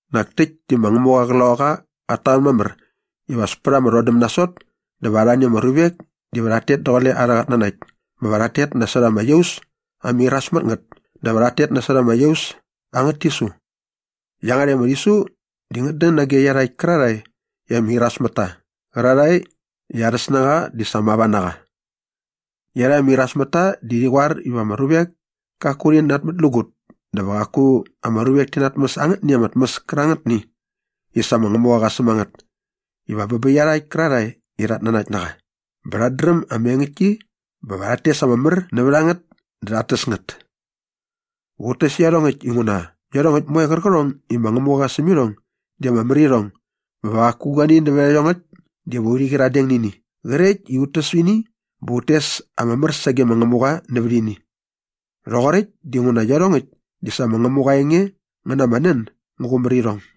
Nak täkt di ma Ngämuqa aa Qloqaqa qat tamän mamär iva as pät ama rhodäm nasot dä va arhani ama ruvek diva rhat tet daqule arhä qatnanakt bä va rhat tet nasot ama iaus ama iras mät ngät dä va rhat tet nasot ama iaus angät tisu. Iangärhäkt ama rhisu di ngät dän nage iarhakt kärarhae i ama iras mät ta qärarhae i arhä snängaqa di sa mava na qa. Iarhakt ama irasmätta di rhi qoar iva ama ruvek kaku rhi natmätlägut dä va qaku ama ruvek ti natmäs angätni ama tmäs kärangätni i sa ma Ngämuqa qa säm a ngät iva bä bä iarhakt kärarhae i rhat nanakt na qa bä rhat dräm ama engäktki bä va rhat tes ama mär nävät a ngät dä rhat täs ngät. Va ut täs iarhongäkt inguna iarhongäkt moe qärqärhong i ma Ngämuqa qa säm irhong di ama mär irhong bä va qaku guani nävät iarhongäkt diva urhi qyiradeng nä ini qrekt i ut täs ini bä ut tes ama mär sage ma Ngämuqa nävät ini. Rhoqoräkt dinguna iarhongäkt di sa ma Ngämuqa aa enge ngä na ama nän ngä qumär irhong.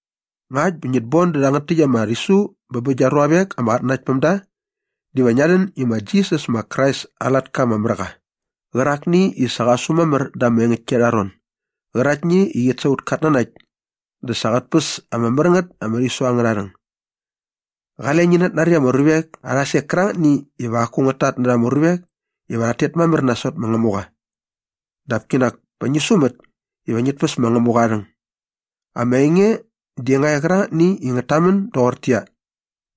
Ngakt bä ngit bon dä rhangät täkt ama rhisu bä bä gia ruavek ama qatnanaktpämda diva ngia rhän i ma Jisas ma Krais aa latka ama mär qa qärakni i sa qa su mamär da ama engäktki arha ron gäraktni i qit sa aut katnanakt dä sa qät päs ama mär ngät ama rhisu angärha rhäng. Qale ngi natnari ama ruvek arha sek kärangätni iva qaku ngät tatnärha ama ruvek iva rhat tet mamär nasot ma Ngämuqa. Dap kinak pa ngi sumät iva ngit päs ma Ngämuqa aa rhäng. Ama enge di nga e qärangätni i ngät tamän doqortäqyia,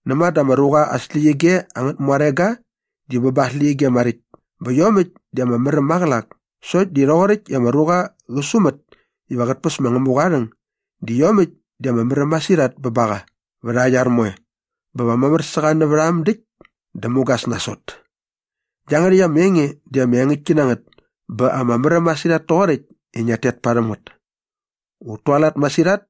näma dä ama ruqa aa släqyige angät muarega di bä ba aa släqyige maräkt bä iomäkt di ama mär äm maqälak sokt di rhoqoräkt i ama ruqa qä sumät iva qät päs ma Ngämuqa aa rhäng di iomäkt di ama mär äm masirhat bä ba qa vät aa iar moe bä va mamär sä qa nävät a äm däkt dä mugas nasot. Iangärhäkt ama enge di ama engäktki na ngät bä ama märäm masirhat toqoräkt i ngia rhet parhäm ngät. Ut tualat masirhat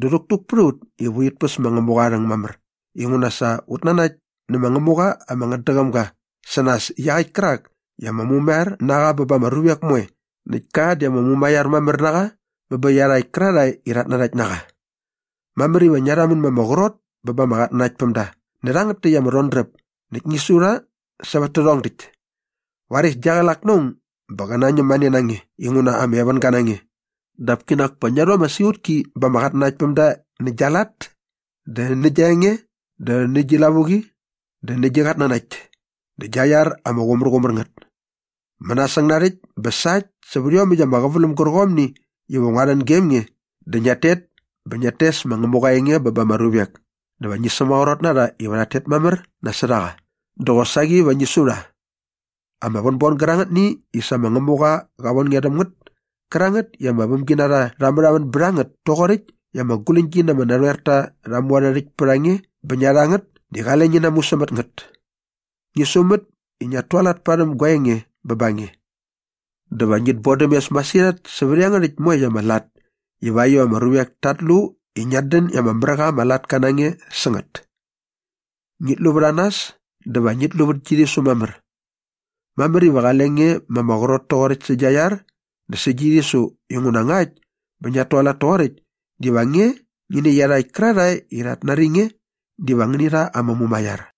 dä rhäktuk pät a ut i urhit päs ma Ngämuqa aa rhäng mamär inguna sa ut nanakt nä ma Ngämuqa ama ngätdäqäm ga sä nas iaqäkt kärak i ama mumaiar na qa bä ba ama ruvek moe näkt ka di ama mumaiar mamär na qa bä bä iarhakt kärarhae i rhat nanakt na qa. Mamär iva ngia rhamän ma ama qrot bä ba ama qatnanaktpämda nä rhangät täkt ama rhodräp näkt ngi su rha sävät tärhong däkt. Varis gia qlak na aung bä qä nañäm mäne na nge inguna ama evänga na nge dap kinak pa ngia rhu ama siqutki ba ama qatnanaktpämda nä gia lat dä nä gia enge dä nä gi lavuqi dä nä gi qatnanakt dä nä gia iar ama qumärqumär ngät. Mänasäng narhäkt bä sa äkt sävät ama qäväläm gärqomni iva ngua rhän gem nge dä ngiat tet bä ngiat tes ma Ngämuqa aa enge bä ba ama ruvek dä va ngi sämaqrot na rha iva rhat tet mamär nasot a qa dä qosaqi va ngi su rha. Ama vänbon gärangätni i sa ma Ngämuqa qa von nge rhäm ngät kärangät i aa vämginarha rha märhamän bät a ngät toqoräkt i ama guläñgi na ama narhoerta rha mu arhä rhäkt pät a nge bä ngia rha ngät di qale ngi namu sämät ngät. Ngi sumät i ngiat tualat parhäm gua enge bä ba nge. Dä va ngit bodäm mes masirhat sävät iangärhäkt moekt ama lat ivakt iva ama ruvek tat lu i ngiat dän i ama mär qa ama latka na nge sä ngät. Ngit lu vät a nas dä va ngit lu vät gi rhisu mamär. Mamär iva qale nge ma ama qrot toqoräkt sä gia iar dä sä gi rhisu inguna ngakt bä ngiat tualat toqoräkt diva nge ngi nä iarhakt kärarhae i rhat nari nge diva ngäni rha ama mumaiar.